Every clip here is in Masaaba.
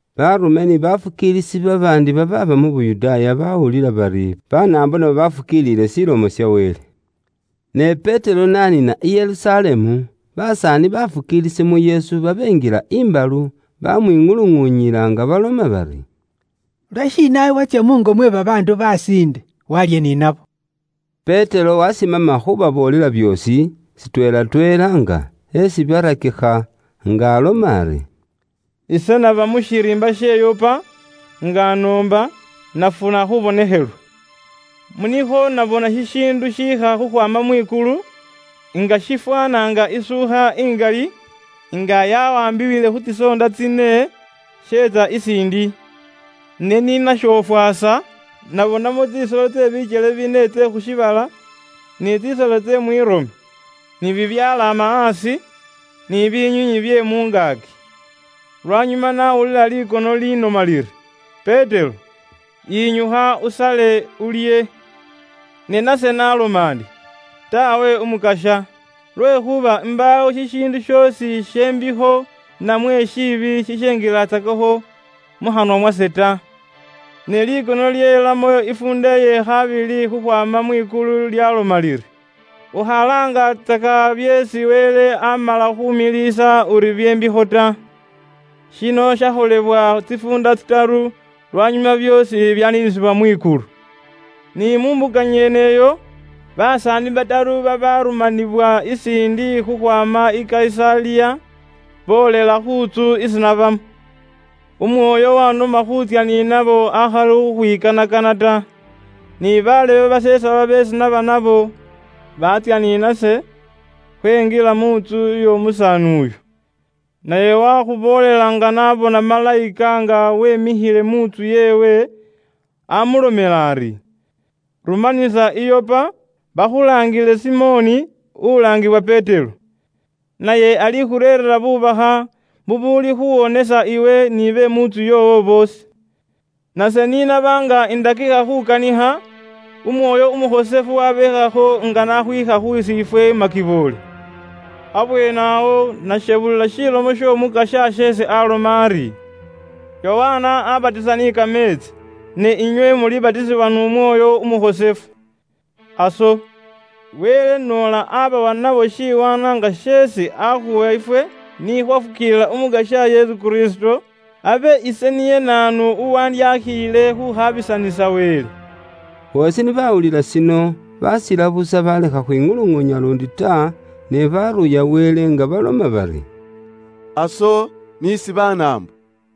Baarume ni baafukiilisi babaandi babaaba mu Yuda baawulila bari Banaambo nabo baafukiiliile Ilomo ya Wele. Ne Petero n'aniina i Yerusalemu, basaani baafukiilisi mu Yesu babenjila imbalu, baamwiŋuluŋuunyila nga baloma bari, “Lwashiina iwe watsya muungo mwe babaandu basiinde, waalya ni nabo?” Petero waasimama khuubaboolela byoosi, shitweelatweela nga eesi byarakikha, nga aloma ari: “Ise naba mu shiriimba she Yopa nga indi mu khuloomba, nafuna khuubonekhelwa. Mu nikhwo nabona shishiindu shiikha khukhwaama mwikulu, nga shifwaana nga isuukha ingali, nga yawaambibwile khu tsisoonda tsine, sheetsa isiindi. Ne ni nashofwasa nabonamo tsisolo tse bikyele bine tse khu shiibala, ni tsisolo tse mwirome, ni bibyalaama aasi, ni binywiinywi bye mu ngaaki. Lwanyuma nawulila likono linoma liri, ‘Petero yinyukha usale, ulye.’ Ne nase naloma ndi, ‘Taawe Umukasya, lwekhuuba imbaawo shishiindu shoosi she mbikho namwe shiibi shishenjilatsakakho mu khanwa mwase ta.’ Ne likono lyelamo ifuunda ye khabili khukhwaama mwikulu lyaloma liri, ‘Ukhalaangatsaka byeesi Wele amala khumiliisa uri bye mbikho ta.’ Shino shakholebwa tsifuunda tsitaru, lwanyuma byoosi byaniinisibwa mwikulu. Ni mu mbuka nyeneyo, basaani bataru babarumanibwa isiindi khukhwaama i Kayisaliya boolela khu ntsu isi nabamo. Umwoyo wanoma khuutsya ni nabo akhali khukhwikanakana ta. Ni bafukiilisi basesaba beesi naba nabo, baatsya ni nase, khwenjila mu ntsu y'omusaani uyo. Naye wakhuboolela nga n'abona malayika nga wemikhile mu ntsu yeewe, amulomela ari, ‘Rumanisa i Yopa, bakhulaangile Simoni ulaangibwa Petero. Naye alikhureerera bubakha bubuuli khuwonesa iwe ni be mu ntsu yoowo boosi.’ Nase ni naba nga indakikha khukanikha, Umwoyo Umukhosefu wabeekhakho nga n'akhwiikha khusiifwe makiboole. Abweenewo nashebulila Ilomo y'Omukasya isi aaloma ari, ‘Yokana abatisa ni kameetsi, ne inywe mulibatisibwa n'Umwoyo Umukhosefu.’ Aso, Wele noola abawa nibo shiwaanwa nga sheesi akhuwa ifwe ni khwafukiilila Umukasya Yesu Kristo, abe ise niye naanu uwandyakhiile khukhabisanisa Wele?” Boosi ni bawulila shino, basila busa balekha khukhwiŋuluŋuunya luundi ta, ne baruuya Wele nga baloma bari, “Aso, n'isi Banaambo,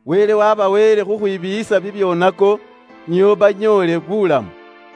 Wele wabaweele khukhwibiiyisa bibyoonako nio banyoole buulamu.”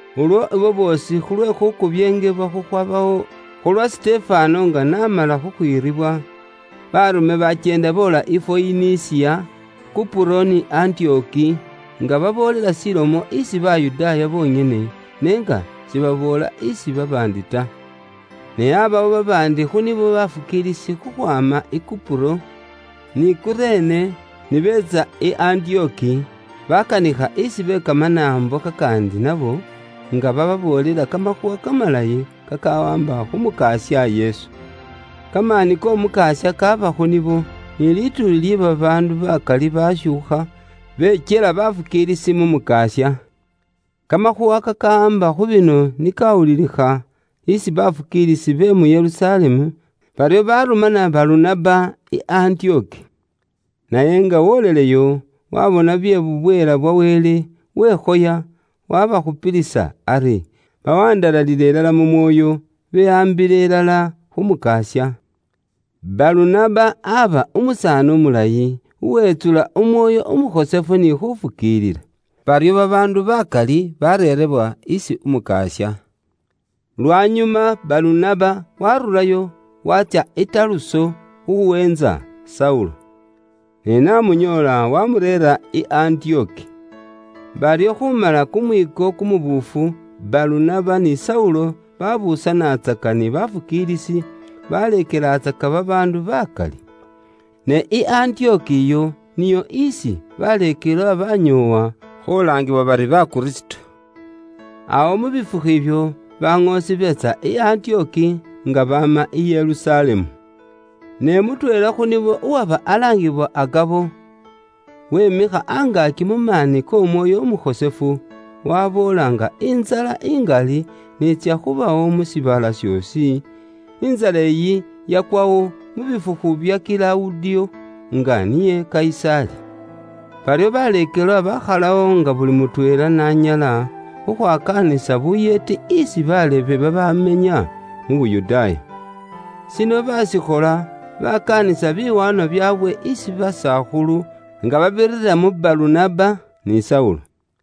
Ulwo abo boosi khu lwe khukubyeengebwa khukhwabawo khu lwa Sitefano nga n'amala khukhwiribwa, baarume bakyeenda boola i Foyinisiya, Kupuro ni Antiyoki, nga baboolela shilomo isi Bayudaaya bonyene, ne nga sibaboola isi babaandi ta. Ne aabawo babaandi khu nibo bafukiilisi khukhwaama i Kupuro, ni Kurene, ni beetsa i Antiyoki, bakanikha isi be Kamanaambo kakaandi nabo, nga bababoolela kamakhuuwa kamalayi kakawaamba khu Mukasya Yesu. Kamaani k'Omukasya kaaba khu nibo, ni lituuli lye babaandu bakali bashuukha bekyela bafukiilisi mu Mukasya. Kamakhuuwa kakawaamba khu bino ni kawulilikha isi bafukiilisi be mu Yerusalemu, baryo barumana Balunaba i Antiyoki. Naye nga woleleyo, waabona bye bubweela bwa Wele, wekhoya, waabakhupilisa ari bawandalalile ilala mu mwoyo, behaambile ilala khu Mukasya. Balunaba aba umusaani umulayi, uwetsula Umwoyo Umukhosefu ni khufukiilila. Baryo babaandu bakali bareerewa isi Umukasya. Lwanyuma Balunaba waarurayo, watsya i Taruso khuweentsa Saulo. Ne n'amunyoola, wamureera i Antiyoki. Baryo khumala kumwiiko kumubuufu, Balunaba ni Saulo babuusanatsaka ni bafukiilisi, baleekelatsaka babaandu bakali. Ne i Antiyoki iyo niyo isi baleekelwa banyoowa khulaangiwa bari Bakristo. Awo mu bifukhu ibyo, baŋoosi beetsa i Antiyoki, nga baama i Yerusalemu. Ne mutweela khu nibo uwaba alaangiwa Agabo, wimikha angaaki mu maani k'Omwoyo Umukhosefu, waboola nga intsala ingali n'itsya khubawo mu shiibala shoosi, (intsala iyi yakwawo mu bifukhu bya Kilawudiyo, nga niye Kayisaali). Baryo baleekelwa bakhalawo nga buli mutweela n'anyala, khukhwakaanisa buyeeti isi bafukiilisi babamenya mu Yuda. Shino baashikhola, baakaanisa biwaanwa byaabwe isi basakhulu nga babirira mu Balunaba ni Saulo.